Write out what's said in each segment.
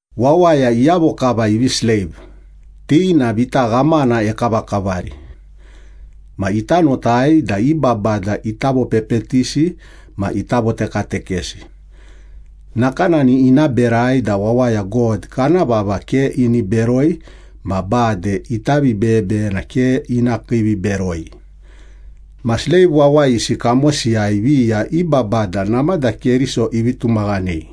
Wawaya iyavo kava ivi sleiv, ti na vita ghamana ekavakavari. Ma ita notai da i babada ita vopepetisi ma ita votekatekesi. Nakanani ina berai da wawaya God kana vava ke ini beroi ma bade ita vibeyebeyena ke ina kiiviberoi. Ma sleiv wawayisi kamosiyai viya i babada namada Keriso ivi tumaghanei.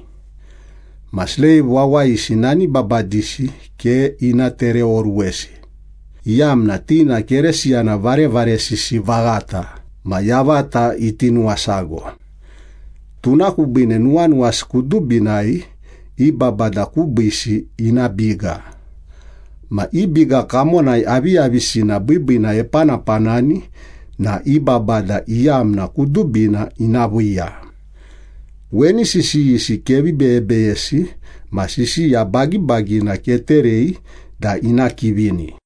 Ma sleiv wawayisi nani babadisi ke ina tereoruwesi, iyamna ti na Keresiyana varevaresisi vaghata ma yavata iti nuwasago. Tuna kubiine nuwanuwasi kudubinai i babada kubiisi ina biga, ma i biga kamonai aviyavisina biibiina epanapanani na i babada iyamna kudubina ina viiya. Weni sisiyisi kevi beyebeyesi ma sisiya bagibagina keterei da ina kivini.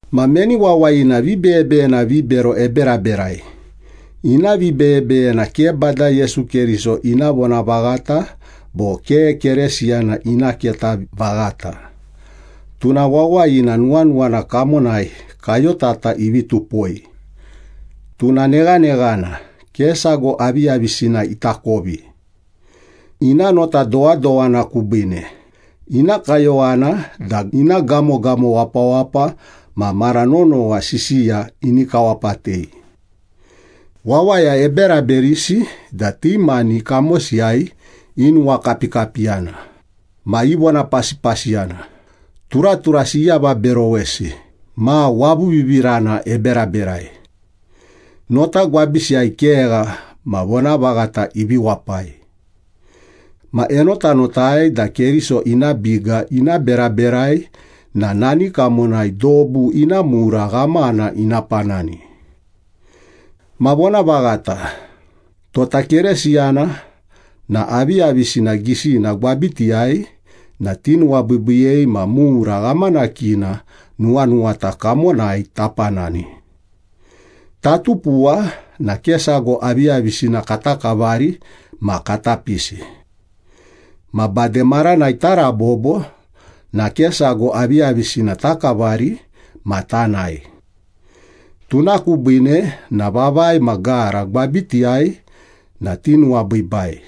Ma meni wawayina vibeyebeyena vibero eberaberai, ina vibeyebeyena ke Bada Yesu Keriso ina vonavaghata bo ke Kerisiyana ina keta vaghata, tuna wawayina nuwanuwana kamonai kayotata ivi tupoi. Tuna neghaneghana, ke sago aviyavisina itakovi. Ina nota dowadowana kubiine, ina kayowana da ina gamogamo wapawapa ma mara nonowa sisiya ini kawapatei. Wawaya eberaberisi da ti mani kamosiyai inuwakapikapiyana, ma ivonapasipasiyana, turaturasi iavaberowesi ma wavuvivirana eberaberai. Nota gwabisiyai kegha ma vonavaghata ivi wapai. Ma enotanotai da Keriso ina biga ina beraberai na nani kamonai dobu ina mura ghamana ina panani. Ma vonavaghata, tota Keresiyana na aviyavisina gisina gwabitiyai na tinuwabiibiiyei ma mura ghamanakina nuwanuwata kamonai tapanani. Tatupuwa na ke sago aviyavisina kata kavari ma kata pisi. Ma bade maranai tarabobo na ke sago aviyavisina takavari ma tanae. Tuna kubiine na vavai ma gara gwabitiyai na tinuwabiibai.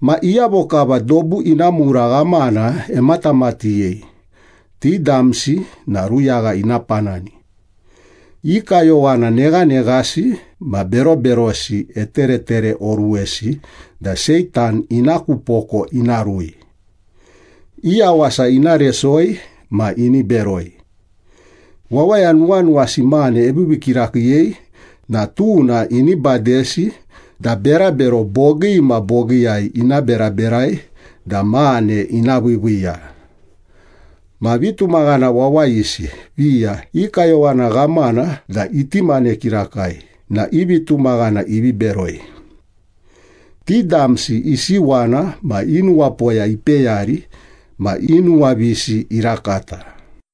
Ma iyavo kava dobu ina mura ghamana ematamatighei, ti damsi na ruyagha ina panani. I kayowana neghaneghasi ma beroberosi eteretereoruwesi da Seitan ina ku poko ina rui. I yawasa ina resoi ma ini beroi. Wawaya nuwanuwasi mane eviivii kirakiiyei na tuna ini badesi da berabero bogii ma bogiiyai ina beraberai da mane ina viiviiya. Ma vitumaghana wawayisi viya i kayowana ghamana da iti mane kirakai na i vitumaghana ivi beroi. Ti damsi isiwana ma i nuwapoya ipeyari ma i nuwavisi irakata.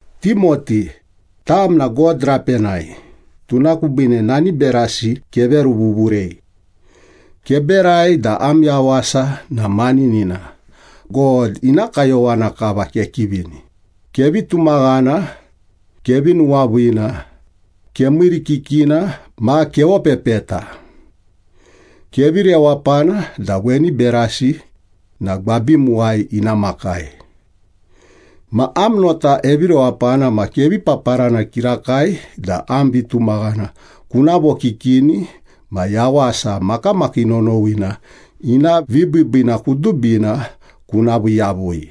Timoti, tam na God rapenai, tuna kubiine nani berasi keveruvuvurei. Keberai da am yawasa na maninina, God ina kayowana kava kekivini, kevi tumaghana, kevi nuwaviina, kemiirikikina ma kevopepeta. Kevi rewapana da weni berasi na gwabimuwai ina makai. Ma am nota evirewapana ma kevi paparana kirakai da am vitumaghana kuna vokikini ma yawasa makamakii nonowina ina vibiibiina kudubina kuna vii yavui.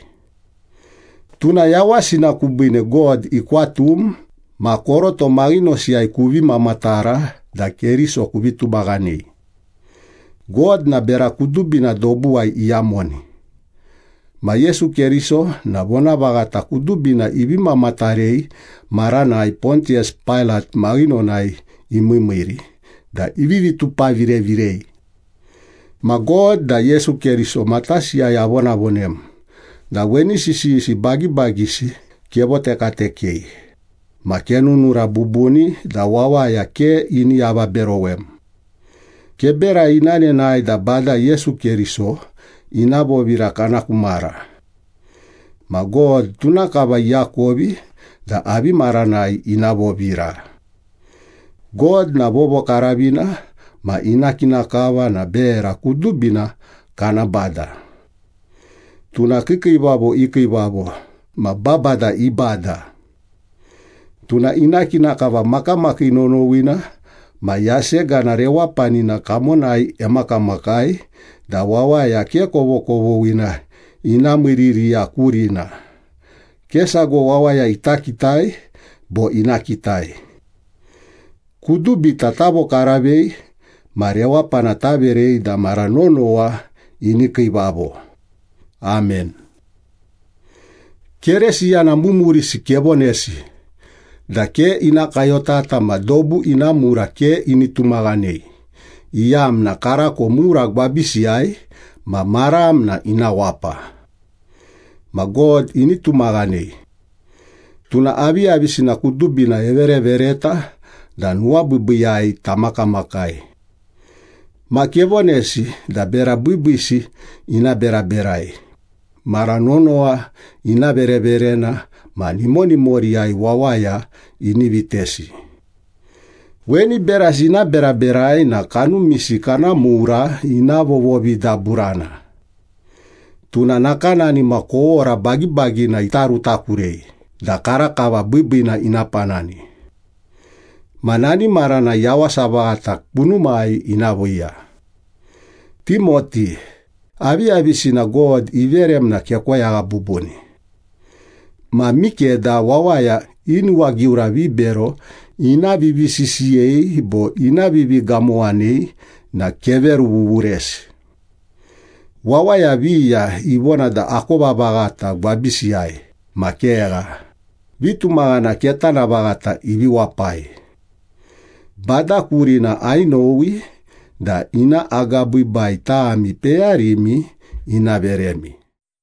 Tuna yawasina kubiine God ikwatum ma koroto maghinosiyai kuvi mamatara da Keriso kuvi tumaghanei. God na bera kudubina dobuwai iyamoni. Ma Yesu Keriso na vonavaghata kudubina ivi mamatarei maranai Pontiyas Pailat maghinonai imiimiiri da ivivi tupavirevirei. Ma God da Yesu Keriso matasiyai avonavonem da weni sisiyisi bagibagisi kevotekatekei ma kenunura bubuni da wawaya ke ini avaberowem. Keberai ina nenae da Bada Yesu Keriso ina vovira kana ku mara. Ma God tuna kava iakovi da avi maranai ina vovira. God na vovokaravina ma ina kina kava na bera kudubina kana Bada. Tuna kiikiivavo i Kiivavo ma babada i Bada. Tuna ina kina kava makamakii nonowina ma yasegana rewapanina kamonai emakamakai da wawaya ke kovokovoghina ina miiririya kurina, ke sago wawaya ita kitai bo ina kitai. Kudubita tavokaravei ma rewapana taverei da mara nonowa ini kiivavo. Amen. Keresiyana mumurisi kevonesi da ke ina kayotata ma dobu ina mura ke ini tumaghanei, iyamna karako mura gwabisiyai ma maram na ina wapa. Ma God ini tumaghanei. Tuna aviyavisina kudubina everevereta da nuwabiibiiyai tamakamakai. Ma kevonesi da bera biibiisi ina beraberai, mara nonowa ina vereverena ma nimonimoriyai wawaya ini vitesi. Weni berasi ina beraberai na kanumisi kana mura ina vovovidaburana. Tuna nakanani ma kowora bagibagina ita rutakurei da karakava biibiina ina panani. Ma nani maranai yawasa vaghata kunumai ina viiya. Timoti, aviyavisina God iverem na kekoyagha bubuni. Ma mikeda wawaya i nuwagiura vibero ina vivisisiyei bo ina vivigamowanei na keveruvuvuresi. Wawaya viya ivona da akova vaghata gwabisiyai ma kegha, vitumaghana ketana vaghata ivi wapai. Bada kurina ainowi da ina agabiibai tami peyarimi ina veremi.